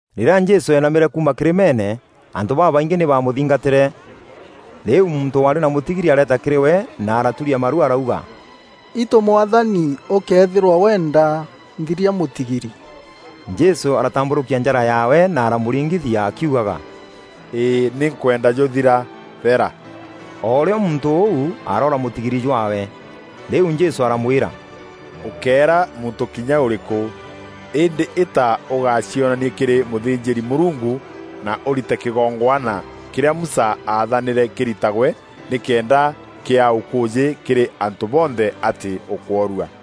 Rîrîa Jesû eenamîre kuuma kîrîmeene, antû babaingî nî baamûthingatîre. Rîu muntû waarî na mûtigiri areeta kîrî we na araturia maru arauga, “Itû Mwathani ûkëethîrwa weenda, nthiria mûtigiri!” Jesû aratambûrûkia njara yaawe na aramûringithia akiugaga, “Îî nî nkwenda jûthira! Thera.” O rîo muntû ûu aroora mûtigiri jwaawe. Rîu Jesû aramwîra, “Ûkéera muntû kinya ûrîkû, îndî îta ûgacionanie kîrî mûthînjîri-Mûrungu na ûrite kîgongwana kîrîa Musa aathanîre kîritagwe, nîkenda kîaa ûkûûjî kîrî antû bonthe atî ûkworua.”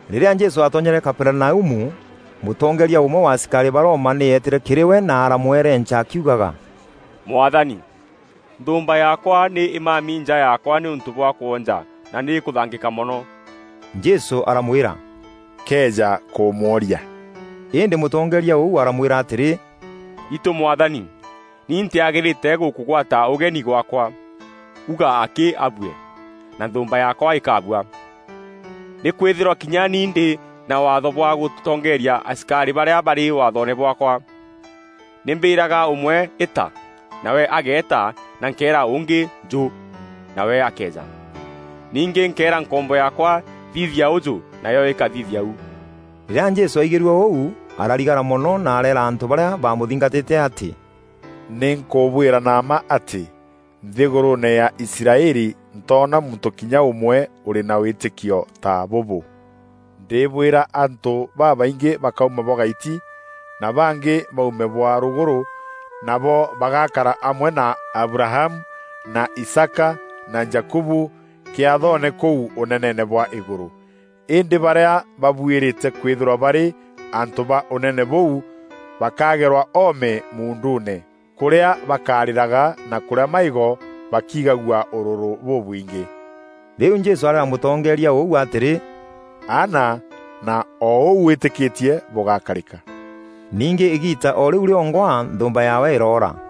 Rîrîa Jesû aatonyere Kaperinaumu, mûtongeeria ûmwe wa asikarî ba Roma nî eetîre kîrî we na aramwerenca akiugaga, “Mwathani, nthûûmba yaakwa nî îmami nja yaakwa nîûntû bwa kwonja na nî îkûthangîka mono.” Jesû aramwîra, “Nkeeja kûmworia.” Îndî mûtongeeria ûu aramwîra atîrî, “Itû Mwathani, ni ntîagîrîte gûkûgwata ûgeni gwaakwa. Uuga akî abue, na nthûûmba yaakwa îkabua. Nî kwînthîrwa kinya ni ndî na waatho bwa gûtongeeria asikarî barîa barî waathoone bwaakwa. Nî mbîraga ûmwe, ‘Îta!’ nawe ageeta na nkeera ûngî, ‘Njû!’ nawe akeeja. Ningî nkeera nkombo yaakwa, ‘Thithia ûjû!’ nayo îkathithia u.” Rîrîa Jesû aigîrue ûu ararigara mono na areera antû barîa baamûthingatîte atî, “Nî nkûbwîra na mma atî, nthîgûrûûne ya Israeli ntoona muntû kinya ûmwe ûrî na wîtîkio ta bûbû. Ndîbwîra antû babaingî bakauma bwa gaiti na bangî baume bwa rûgûrû, nabo bagakara amwe na Abrahamu na Isaaka na Jakubu kîathoone kûu ûneneene bwa îgûrû. Îndî barîa babuîrîte kwîthîrwa barî antû ba ûnene bûu bakagerwa oome muunduune, kûrîa bakarîraga na kûrîa maîgo bakiigagua ûrûrû bûbwingî.” Rîu Jesû areera mûtongeeria ûu atîrî, “Aana, na o ûu wîtîkîtie bûgakarîka.” Ningî îgiita o rîu rîongwa nthûûmba yaawe îroora.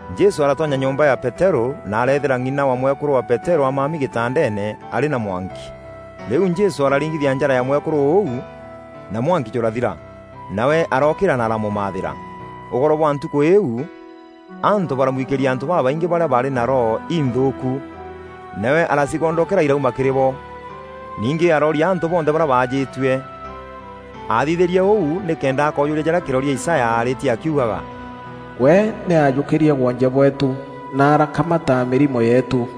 Jesû aratonya nyomba ya Peterû na areethîra ng'ina wa mwekûrû wa Peterû amami gîtandeene arî na mwanki. Rîu Jesû araringithia njara ya mwekûrû ûu, na mwanki jûrathira. Nawe arookîîra na aramûmathîra. Ûgoro bwa ntukû îîu, antû baramwikîria antû babaingî barîa baarî na roho inthûûku. Nawe aracigondokera irauma kîrî bo. Ningî arooria antû bonthe barîa baajîtue. Aathithîrie ûu nîkenda akoojûria jarîa kîroria Isaya aarîtie akiugaga, “We nî ajûkîrie woonje bweetû, na arakamata mîrimo yeetû.”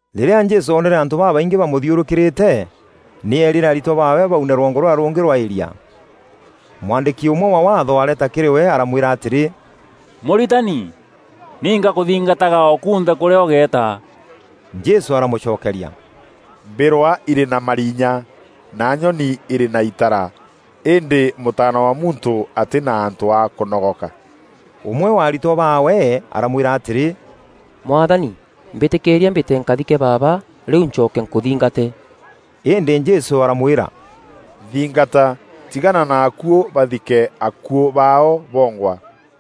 Rîrîa Jesû oonere antû babaingî bamûthiûrûkîrîte, nî eerîre aritwa baawe baune rwongo rûrîa rûngî rwa îria. Mwandîki ûmwe wa Waatho areeta kîrî we aramwîra atîrî, “Mûritani, ni ngakûthingataga o kunthe kûrîa ûgeeta.” Jesû aramûcokeria, “Mbîrwa irî na marinya, na nyoni irî na itara, îndî Mûtaana wa Muntû atî na antû a kûnogoka.” Ûmwe wa aritwa baawe aramwîra atîrî, “Mwathani, mbîtîkîîria mbîte nkathike baaba rîu ncoke nkûthingate.” Îndî Jesû aramwîra, “Nthingata; tigana na akuû bathike akuû baao bongwa.”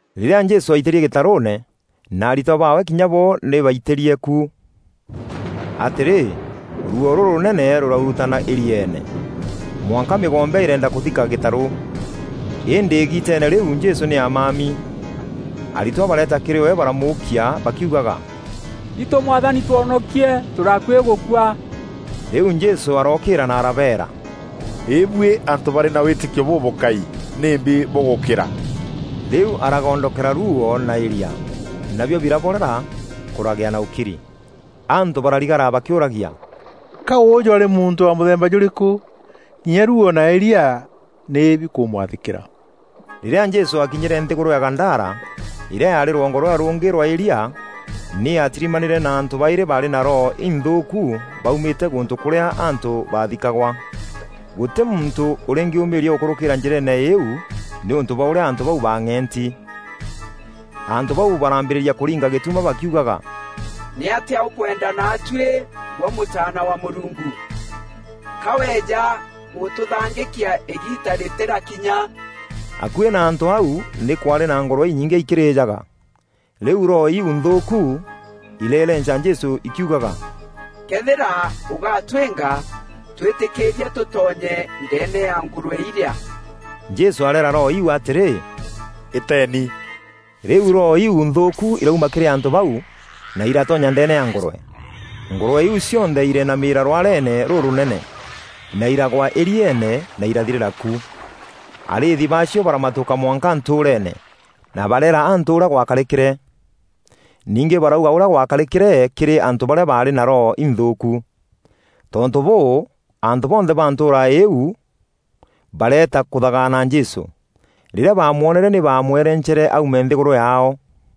Rîrîa Jesû aitîrie gîtarûûne, na aritwa baawe kinya bo nî baitîrie ku. Atîrî, ruuo rûrûnene rûraurutana îrieene, mwanka mîgombe îreenda kûthika gîtarû. Îndî îgiiteene rîu Jesû nî amami. Aritwa bareeta kîrî we baramûûkia bakiûgaga, “Itû Mwathani, twonokie, tûrî akuî gûkua!” Rîu Jesû arookîîra na arabeera, “Îbuî antû barî na wîtîkio bûbûkai; nîmbi bûgûkîra?” Rîu aragondokera ruuo na îria, nabio biraborera kûragîa na ûkiri. Antû bararigara bakîûragia, “Ka ûjû arî muntû wa mûthemba jûrîkû? Kinya ruuo na îria nî bikûmwathîkîra!” Rîrîa Jesû aakinyîre nthîgûrû ya Gadara, îrîa yaarî rwongo rûrîa rûngî rwa îria, nî aatirimanîre na antû baîrî baarî na roho inthûûku baumîte gûntû kûrîa antû baathikagwa. Gûtî muntû ûrîngîûmîîria gûkûrûkîra njîreene îîu nîûntû bwa ûrîa antû bau baang'eenti. Antû bau baraambîrîria kûringa gîtuma bakiugaga, “Nîatîa ûkwenda naatuî, gwe Mûtaana wa Mûrungu? Ka weeja gûtûthangîkia îgiita rîtîrakinya?” Akuî na antû au nî kwaarî na ngûrwe inyingî ikîrîjaga. Rîu roho iu nthûûku ireerenca Jesû ikiugaga, “Këethîra ûgatwînga, twîtîkîîrie tûtonye ndeene ya ngûrwe irîa.” Jesû areera roho iu atîrî, “Îteeni.” Rîu roho iu nthûûku irauma kîrî antû bau, na iratonya ndeene ya ngûrwe. Ngûrwe iu cionthe ireenamîra rwareene rûrûnene, na îragwa îrieene na irathirîra ku. Arîîthi baacio baramatûka mwanka ntûûreene, na bareera antû ûrîa gwakarîkîre. Ningî barauga ûrîa gwakarîkîre kîrî antû barîa baarî na roho inthûûku. Tontû bûû, antû bonthe ba ntûûra îîu bareeta kûthagaana Jesû. Rîrîa baamwonere nî baamwerencere aume nthîgûrû yaao.